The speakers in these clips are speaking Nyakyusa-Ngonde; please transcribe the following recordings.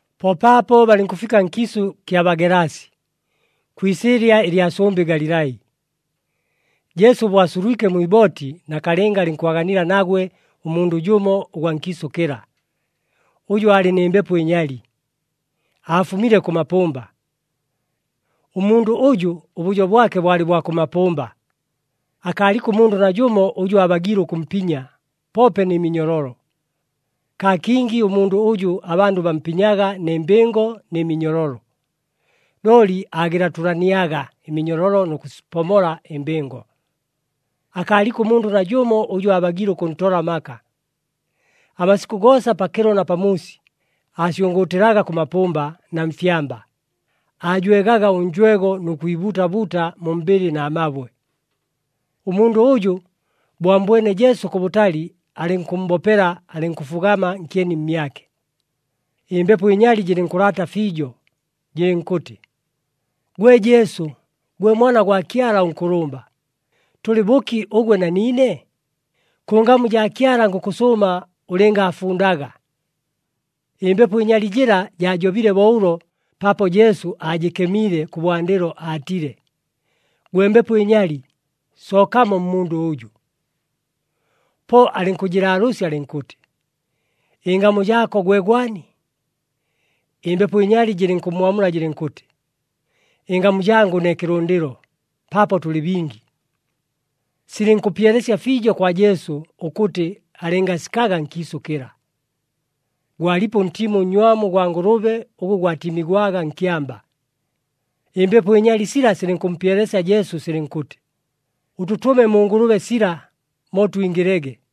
Po paapo balɨnkʉfika nkiisʉ kya Bagelasi, kwi isɨɨlya ɨlya sʉmbɨ Galilai. Jesu bo asulwike mwi ibooti, nakalɨnga alɨnkwaganila nagwe ʉmundʉ jʉmo ʉgwa nkiisʉ kɨla, ʉjʉ aalɨ nɨ mbepo ɨnyali, aafumile kʉ mapʉmba. Ʉmundʉ ʉjʉ ʉbʉjo bwake bwalɨ bwa kʉ mapʉmba. Akaaliko ʉmundʉ najʉmo ʉjʉ aabagiile ʉkʉmpinya, poope nɨ minyololo. Kaa kingi ʉmundʉ ʉjʉ abandʉ bampinyaga nɨ mbɨngo nɨ minyololo, looli aagɨlatʉlaniaga ɨminyololo nʉ kʉsipomola ɨmbɨngo. Akaaliko ʉmundʉ najʉmo ʉjʉ aabagiile ʉkʉntola amaka. Amasikʉ goosa, pakɨlo na pamuusi, aasyʉngʉʉtɨlaga kʉ mapʉmba na mfyamba, aajwegaga ʉnjwego nʉ kwibuuta buuta mu mbɨlɨ na mabwe. Ʉmundʉ ʉjʉ, bo ammbwene Jesu kʉbʉtali alɨnkʉmmbopela, alɨnkʉfugama nkyeni mmyake. Ɨmbepo ɨnyali jɨlɨnkʉlaata fiijo, jɨlɨnkʉtɨ, “Gwe Jesu, gwe Mwana gwa Kyala ʉNkʉlʉmba, tʉlɨ bʉki ʉgwe na niine? Kʉ ngamu jaa Kyala ngʉkʉsʉʉma ʉlɨngaafundaga!” Ɨmbepo ɨnyali jɨla jaajobile bo ʉlo paapo Jesu aajɨkemiile kʉbwandɨlo aatile, “Gwe mbepo ɨnyali, sookamo mmundʉ ʉjʉ!” Po alɨnkʉjɨlaalʉʉsya alɨnkʉtɨ, “Ɨngamu jaako gwe gwani?” Ɨmbepo ɨnyali jɨlɨnkʉmmwamula jɨlɨnkʉtɨ, “Ɨngamu jangʉ ne Kɨlʉndɨlo, paapo tʉlɨ bingi.” Silɨnkʉpyelesya fiijo kwa Jesu ʉkʉtɨ alɨngasikaga nkiisʉ kɨla. Gwalipo ʉntiimo ʉnnywamu ʉgwa ngʉlʉbe ʉgʉ gwatiimigwaga nkyamba. Ɨmbepo ɨnyali sila silɨnkʉmpyelesya Jesu silɨnkʉtɨ, “Ʉtʉtʉme mu ngʉlʉbe sila, mo twingɨlege.”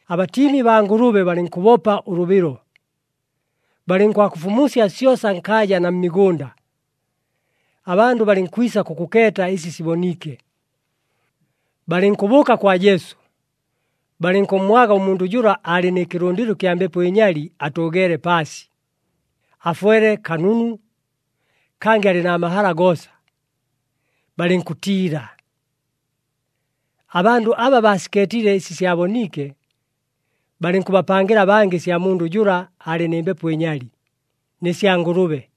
Abatiimi baa ngʉlʉbe balɨnkʉbopa ʉlʉbɨlo, balɨnkwakʉfumusya syosa nkaaja na mmigʉnda. Abandʉ balɨnkwisa kʉkʉkeeta ɨsi siboniike. Balɨnkʉbʉʉka kwa Jesu, balɨnkʉmmwaga ʉmundʉ jʉla aalɨ nɨ kɨlʉndɨlo ɨkya mbepo ɨnyali atʉʉgeele paasi, afwele kanunu, kangɨ alɨ na mahala goosa, balɨnkʉtiila. Abandʉ aba baasikeetile ɨsi syaboniike, balɨnkʉbapangɨla abangɨ ɨsya mundʉ jʉla aalɨ nɨ mbepo ɨnyali, nɨ sya ngʉlʉbe.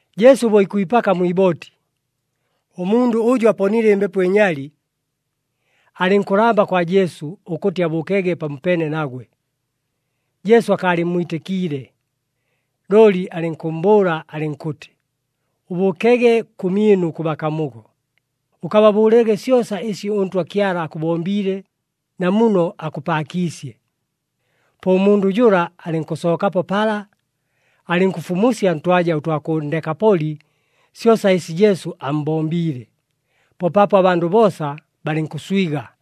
Jesu bo ikwipaka mwi ibooti, ʉmundʉ ʉjʉ aponile ɨmbepo ɨnyali, alɨnkʉlamba kwa Jesu ʉkʉtɨ abʉʉkege pamopeene nagwe. Jesu akaalɨmmwitɨkiile, looli alɨnkʉmmbʉʉla alɨnkʉtɨ, “Ʉbʉʉkege kʉmyɨnu kʉ bakamugo, ʉkababʉʉlege syosa ɨsi ʉNtwa Kyala akʉbombiile na muno akʉpaakiisye.” Po ʉmundʉ jʉla alɨnkʉsookapo pala, alɨnkʉfumusya ntwaja ʉtwa kʉ Ndekapoli syosa ɨsi Jesu ammbombiile. Po paapo abandʉ boosa balɨnkʉswiga.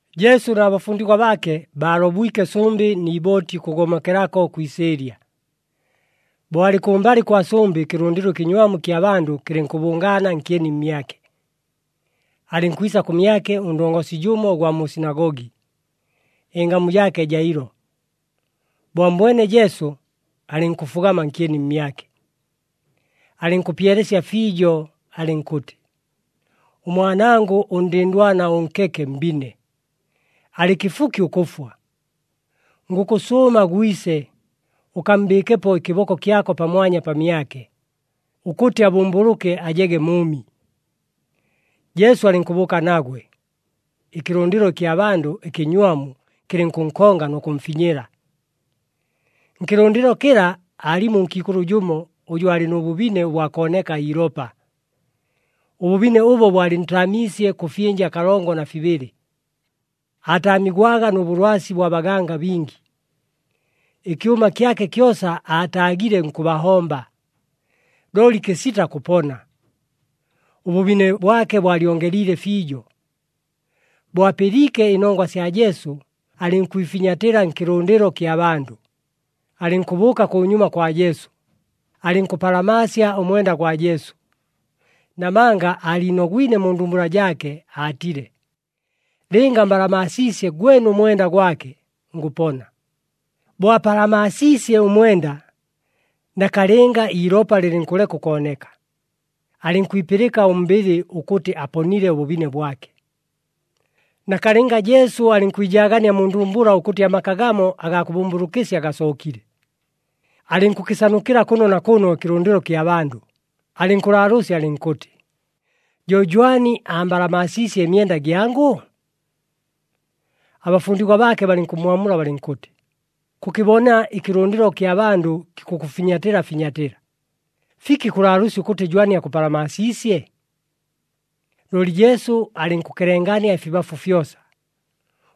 Jesu na bafundigwa baake, baalobwike sʉmbɨ ni ibooti ʉkʉgomokelako kwi isɨɨlya. Bo alɨ kʉmbalɨ kwa sʉmbɨ ɨkɨlʉndɨlo ɨkɨnywamu ɨkya bandʉ kɨlɨnkʉbʉngaana nkyeni mmyake. Alɨnkwisa kʉmyake ʉndongosi jʉmo ʉgwa mu sinagogi, ɨngamu jaake Jailo. Bo ammbwene Jesu, alɨnkʉfugama nkyeni mmyake. Alɨnkʉpyelesya fiijo, alɨnkʉtɨ, “Ʉmwanangʉ ʉndɨndwana ʉnkeke mbine, alɨ kɨfuki ʉkʉfwa. Ngʉkʉsʉʉma gwise, ʉkammbɨɨkepo ɨkɨboko kyako pamwanya pamyake, ʉkʉtɨ abʉmbʉlʉke ajege mʉʉmi.” Jesu alɨnkʉbʉʉka nagwe. Ɨkɨlʉndɨlo ɨkya bandʉ ɨkɨnywamu kɨlɨnkʉnkonga nʉ kʉmfinyɨla. Nkɨlʉndɨlo kɨla, aalimo ʉnkiikʉlʉ jʉmo, ʉjʉ aalɨ nʉ bʉbine bwa kooneka iilopa. Ʉbʉbine ʉbo bwalɨntaamiisye kʉ fyɨnja kalongo na fibɨlɨ. Aataamigwaga nʉ bʉlwasi bwa baganga bingi, ɨkyʉma kyake kyosa aataagile nkʉbahomba, looli kɨsita kʉpona. Ʉbʉbine bwake bwalyongeliile fiijo. Bo apɨliike ɨnongwa sya Jesu, alɨnkwifinyatɨla nkɨlʉndɨlo kya bandʉ, alɨnkʉbʉʉka kʉnyuma kwa Jesu, alɨnkʉpalamaasya ʉmwenda gwa Jesu. Namanga aaliinogwine mu ndumbula jaake, aatile, “Lɨnga mbalamaasiisye gwene ʉmwenda gwake, ngʉpona.” Bo apalamaasiisye ʉmwenda, nakalɨnga iilopa lɨlɨnkʉleka ʉkooneka, alɨnkwipɨlɨka ʉmbɨlɨ ʉkʉtɨ aponile ʉbʉbine bwake. Nakalɨnga Jesu alɨnkwijaagania mu ndumbula ʉkʉtɨ amaka gamo agaa kʉbʉmbʉlʉkɨsya gasookile. Alɨnkʉkɨsanukɨla kʉno na kʉno ɨkɨlʉndɨlo kya bandʉ, alɨnkʉlaalʉʉsya alɨnkʉtɨ, “Jo jwani ambalamaasiisye ɨmyenda gyangʉ?” Abafundigwa baake balɨnkʉmmwamula balɨnkʉtɨ, “Kʉkɨbona ɨkɨlʉndɨlo kya bandʉ kikʉkʉfinyatɨla finyatɨla. Fiki kʉlaalʉʉsya ʉkʉtɨ jwani akʉpalamaasiisye?” Looli Jesu alɨnkʉkelengania ɨfibafu fyosa,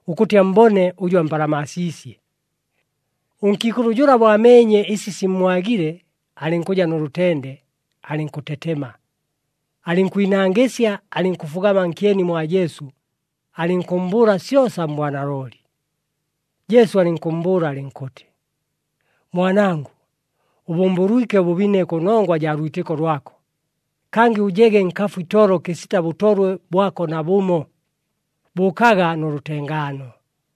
ʉkʉtɨ ammbone ʉjʉ ampalamaasiisye. Ʉnkiikʉlʉ jʉla bo ameenye ɨsi simmwagile, alɨnkʉja nʉ lʉtende, alɨnkʉtetema, alɨnkwinangɨsya, alɨnkʉfugama nkyeni mwa Jesu, alɨnkʉmmbʉʉla syosa mbwanalooli. Jesu alɨnkʉmmbʉʉla alɨnkʉtɨ, “Mwanangʉ, ʉbʉmbʉlwike ʉbʉbine kʉnongwa jaa lwitɨko lwako. Kangɨ ʉjege nkafu itolo kɨsita bʉtolwe bwako nabʉmo. Bʉʉkaga nʉ lʉtengaano.”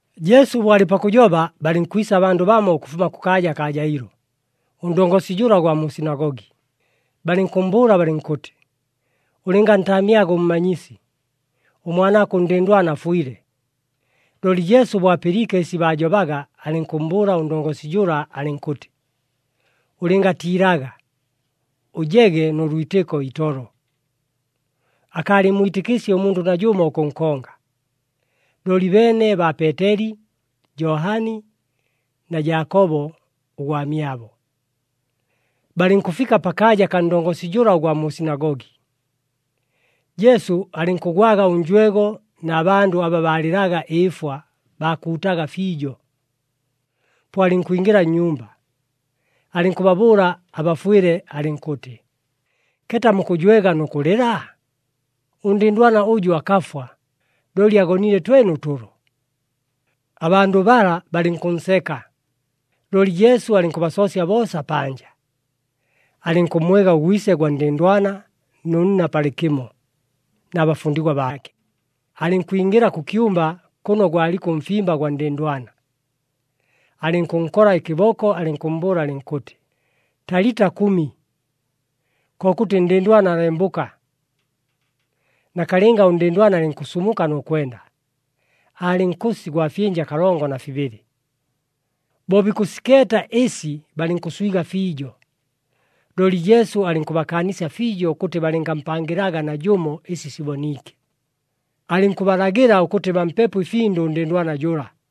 Jesu bo alɨ pakʉjoba, balɨnkwisa abandʉ bamo ʉkʉfuma kʉkaaja kaa Jailo, ʉndongosi jʉla ʉgwa mu sinagogi, balɨnkʉmmbʉʉla balɨnkʉtɨ, “Ʉlɨngantaamyaga ʉMmanyisi, ʉmwanaako ʉndɨndwana afwile.” Looli Jesu bo apɨliike ɨsi baajobaga, alɨnkʉmmbʉʉla ʉndongosi jʉla, alɨnkʉtɨ, “Ʉlɨngatiilaga, ʉjege nʉ lwitɨko itolo.” Akaalɨmmwitɨkiisye ʉmundʉ najʉmo ʉkʉnkonga, looli beene baa Peeteli, Johani na Jaakobo ʉgwamyabo. Balɨnkʉfika pakaaja kaa ndongosi jʉla ʉgwa mu sinagogi, Jesu alɨnkʉgwaga ʉnjwego na bandʉ aba baalɨlaga ɨɨfwa, baakuutaga fiijo. Po alɨnkwingɨla nnyumba, alɨnkʉbabʉʉla abafwɨle, alɨnkʉtɨ, “Keeta mukʉjwega nʉ kʉlɨla? Ʉndɨndwana ʉjʉ akafwa, looli agonile twene ʉtʉlo.” Abandʉ bala balɨnkʉnseka, looli Jesu alɨnkʉbasoosya boosa panja. Alɨnkʉmmwega ʉgwise gwa ndɨndwana nʉ nna palɨkɨmo na bafundigwa baake, alɨnkwingɨla kʉ kyumba kʉno gwaliko ʉmfimba gwa ndɨndwana. Alɨnkʉnkola ɨkɨboko, alɨnkʉmmbʉʉla alɨnkʉtɨ, “Talita, kʉmi!” Kokʉtɨ, “Ndɨndwana, lembʉka!” Nakalɨnga ʉndɨndwana alɨnkʉsumuka nʉ kwenda. Aalɨ nkʉsi gwa fyɨnja kalongo na fibɨlɨ. Bo bikʉsikeeta ɨsi balɨnkʉswiga fiijo. Looli Jesu alɨnkʉbakaanisya fiijo ʉkʉtɨ balɨngampangɨlaga najʉmo ɨsi siboniike. Alɨnkʉbalagɨla ʉkʉtɨ bampepo ɨfindʉ ʉndɨndwana jʉla.